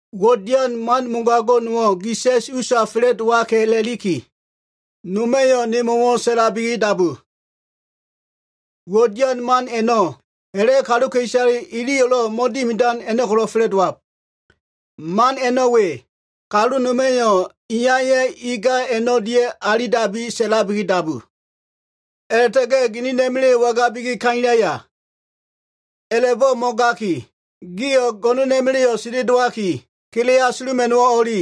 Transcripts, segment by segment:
Uwo꞉ dian man mogago꞉ nowo꞉ sa꞉s gi usa fa꞉la꞉dowaka꞉ a꞉la꞉liki, noma꞉yo꞉ nemo꞉wo꞉ sa꞉labi dabu. Uwo꞉ dian man a꞉no꞉ ha꞉la꞉ kaluka꞉isale iliyo꞉lo꞉ mo꞉dimidan a꞉no꞉ ko꞉lo꞉ fa꞉la꞉dowab. Man a꞉no꞉ we, kalu noma꞉yo꞉ iyaya꞉ inga a꞉no꞉ o꞉lia꞉ alilab a꞉la꞉sa꞉labi dabu. A꞉la꞉ta꞉ga꞉ ginina꞉ma꞉la꞉yo꞉ wangabiki kailaya? A꞉la꞉bo꞉ mo꞉gaki, gio꞉ go꞉no꞉na꞉ma꞉la꞉yo꞉ sendelowaki, kele asuluma꞉no꞉wo꞉ o꞉li.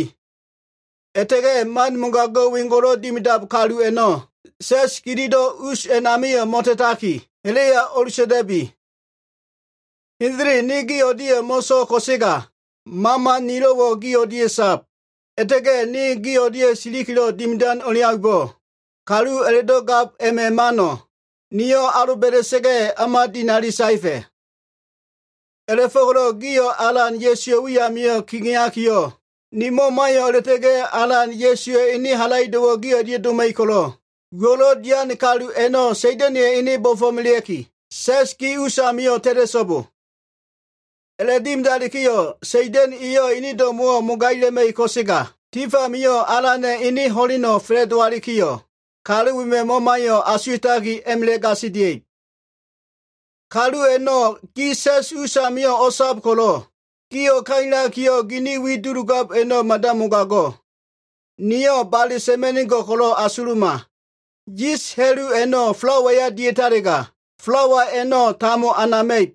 A꞉la꞉ta꞉ga꞉ man mogago꞉ wengo꞉lo꞉ dimidab kalu a꞉no꞉ sa꞉s gililo꞉ us a꞉namio꞉ mo꞉ta꞉taki, ha꞉la꞉ya o꞉ta꞉ta꞉bi. Hendele ne gi o꞉lia꞉yo꞉ mo꞉so꞉l ko꞉sega, mama nilo꞉wo꞉ gi o꞉lia꞉ sab. A꞉la꞉ta꞉ga꞉ ne gi o꞉lia꞉ silikilo꞉ dimidan o꞉leaumbo꞉, kalu a꞉la꞉do꞉ gab a꞉ma꞉ mano꞉ niyo꞉ aloba꞉da꞉sa꞉ga꞉, o꞉ma dinali saefa꞉. A꞉la꞉fo꞉ko꞉lo꞉ gio꞉ Alan Ya꞉suwa꞉ wi amio꞉ kegeakiyo꞉, ni mamayo꞉ a꞉la꞉ta꞉ga꞉ Alan Ya꞉suwa꞉ ene halaido꞉wo꞉lo꞉ gi o꞉lia꞉ doma꞉ib ko꞉lo꞉, uwo꞉lo꞉ dian kalu a꞉no꞉ Sa꞉da꞉na꞉ya꞉ ene bo꞉fo꞉melea꞉ki, sa꞉s gi us amio꞉ ta꞉ta꞉so꞉bo. A꞉la꞉dimidalikiyo꞉, Sa꞉da꞉na꞉ eyo꞉ ene do꞉mo꞉wo꞉ mogaila꞉ma꞉ib, ko꞉sega tif amio꞉ Alana꞉ ene ho꞉leno꞉ fa꞉la꞉dowalikiyo꞉, kalu wema꞉ mamayo꞉ asuwa꞉taki a꞉ma꞉la꞉ gasilia꞉ib. Kalu a꞉no꞉ gi sa꞉s usamio꞉ o꞉sab ko꞉lo꞉, gio꞉ kailakiyo꞉, gini wi duludab a꞉no꞉ mada mogago꞉. Niyo꞉ bale sa꞉ma꞉nigo꞉l ko꞉lo꞉ asuluma. Yis ha꞉lu a꞉no꞉ falawaya dia꞉talega, falawa a꞉no꞉ tambo anama꞉ib.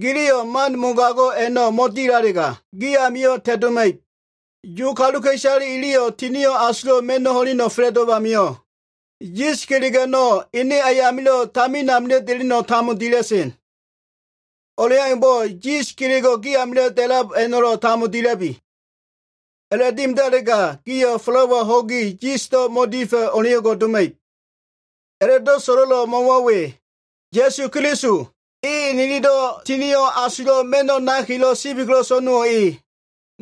Giliyo꞉ man mogago꞉ a꞉no꞉ mo꞉dilalega, gi amio꞉ ta꞉noma꞉ib. Yu kaluka꞉isale iliyo꞉ Tinio꞉ Asulo꞉ Ma꞉no꞉ ho꞉leno꞉ fa꞉la꞉dowab amio꞉, yis kelego꞉ a꞉no꞉ ene ayamilo꞉ tamin deleno꞉ tambo dila꞉sen. O꞉leaumbo꞉ yis kelego꞉ gi amio꞉ da꞉lab a꞉no꞉lo꞉ tambo dila꞉bi. A꞉la꞉dimidalega, gio꞉ falawa ho꞉gi, yisdo꞉ mo꞉difa꞉ o꞉leo꞉ngo꞉ doma꞉ib. A꞉la꞉do꞉ so꞉lo꞉lo꞉ mo꞉wo꞉ we. Ya꞉su Keliso, e nililo꞉ Tinio꞉ Asulo꞉ ma꞉no꞉ nakilo꞉ sibi ko꞉lo꞉ so꞉no꞉wo꞉ e.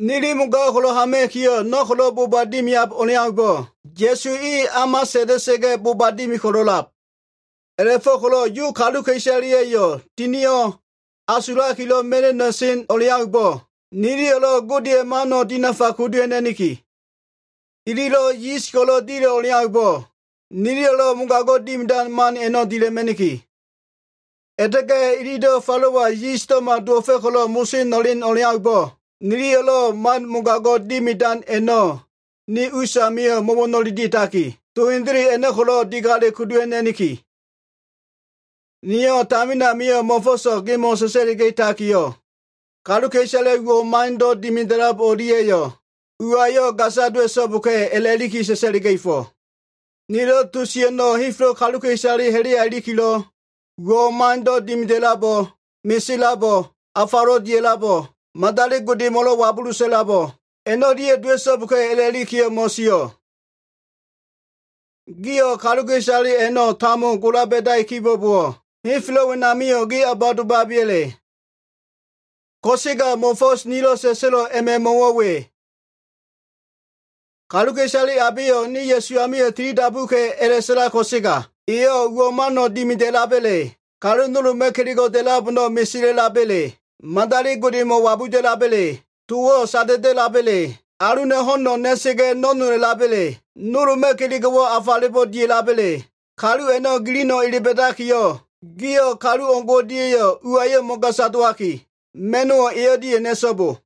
Nili mogago꞉ ko꞉lo꞉ hama꞉kiyo꞉, no꞉ ko꞉lo꞉ boba dimian o꞉leaumbo꞉, Ya꞉su e o꞉ma sa꞉nda꞉sa꞉ga꞉ boba dimi ko꞉lo꞉lab. A꞉la꞉fo꞉ko꞉lo꞉ Yu kaluka꞉isaleya꞉yo꞉ Tinio꞉ Asulakilo꞉ ma꞉no꞉ na꞉sen o꞉leaumbo꞉, niliyo꞉lo꞉ Godeya꞉ mano꞉ dinafa kudu ha꞉na꞉niki. Ililo꞉ yis ko꞉lo꞉ dila꞉ o꞉leaumbo꞉, niliyo꞉lo꞉ mogago꞉ dimidan man a꞉no꞉ dila꞉ma꞉niki. A꞉la꞉ta꞉ga꞉ ililo꞉ falawa yisdo꞉ma dowo꞉fa꞉ ko꞉lo꞉ moso na꞉len o꞉leaumbo꞉, niliyo꞉lo꞉ man mogago꞉ dimidan a꞉no꞉ ni usamio꞉ mo꞉wo꞉no꞉le dia꞉taki, to hendele a꞉no꞉ ko꞉lo꞉ digale kudu ha꞉na꞉niki. Niyo꞉ tamin amio꞉ mo꞉fo꞉so꞉ gemo꞉ sa꞉sa꞉liga꞉takiyo꞉, kaluka꞉isale uwo꞉ mando꞉ dimida꞉lab o꞉lia꞉yo꞉ uwayo꞉ gasa dowa꞉so꞉boka꞉ a꞉la꞉li sa꞉sa꞉liga꞉fo꞉. Nilo꞉ to sio꞉ a꞉no꞉ henfelo꞉ kaluka꞉isale ha꞉la꞉ya ilikilo꞉, uwo꞉ mando꞉ dimida꞉labo꞉, mesela꞉labo꞉, afalo꞉ dia꞉labo꞉, madali godemo꞉lo꞉ wabulu sa꞉la꞉lab a꞉no꞉lia꞉yo꞉ dowa꞉so꞉boka꞉ a꞉la꞉likiyo꞉ mo꞉sio꞉. Gio꞉ kaluka꞉isale a꞉no꞉ tambo gola ba꞉dai kibo꞉bowo꞉, henfelo꞉ wenamio꞉ ge o꞉ba domabeya꞉le? Ko꞉sega mo꞉fo꞉s nilo꞉ sa꞉sa꞉lo꞉ a꞉ma꞉ mo꞉wo꞉ we. Kaluka꞉isale abeyo꞉ ne Ya꞉su amio꞉ tilidabuka꞉ a꞉la꞉sa꞉lab ko꞉sega, eyo꞉ uwo꞉ mano꞉ dimida꞉laba꞉le, kalu nolba꞉ kelego꞉ da꞉lab a꞉no꞉ mesela꞉laba꞉le, madali godemo꞉ wabuda꞉laba꞉le, towo꞉ sada꞉da꞉laba꞉le, aluna꞉ ho꞉no꞉ na꞉sa꞉ga꞉ no꞉nola꞉laba꞉le, nolba꞉ kelego꞉wo꞉ afalebo꞉ dia꞉laba꞉le, kalu a꞉no꞉ giliyo꞉ ele ba꞉dakiyo꞉, gio꞉ kalu o꞉ngo꞉ o꞉lia꞉yo꞉ uwayo꞉ mo꞉gasa dowaki, ma꞉no꞉wo꞉ e o꞉lia꞉yo꞉ na꞉so꞉bo.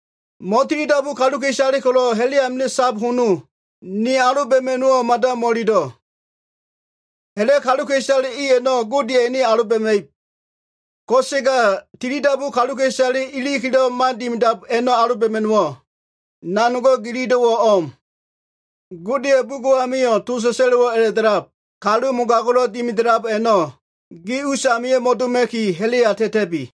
Mo꞉tilidabu kaluka꞉isale ko꞉lo꞉ ha꞉la꞉ amilo꞉ sab hono, ni aloba꞉ma꞉no꞉wo꞉ mada mo꞉ililo꞉. Ha꞉la꞉ kaluka꞉isale i a꞉no꞉ Godeya꞉ ene aloba꞉ma꞉ib. Ko꞉sega tilidabu kaluka꞉isale ilikilo꞉ man dimidab a꞉no꞉ ko꞉lo꞉ aloba꞉ma꞉no꞉wo꞉, nanogo꞉ gililo꞉wo꞉ o꞉m. Godeya꞉ bugo꞉ amio꞉ to sa꞉sa꞉lo꞉wo꞉ a꞉la꞉da꞉lab, “Kalu mogago꞉lo꞉ dimida꞉lab a꞉no꞉ gi usamio꞉ mo꞉doma꞉ki ha꞉la꞉ya ta꞉ta꞉bi.”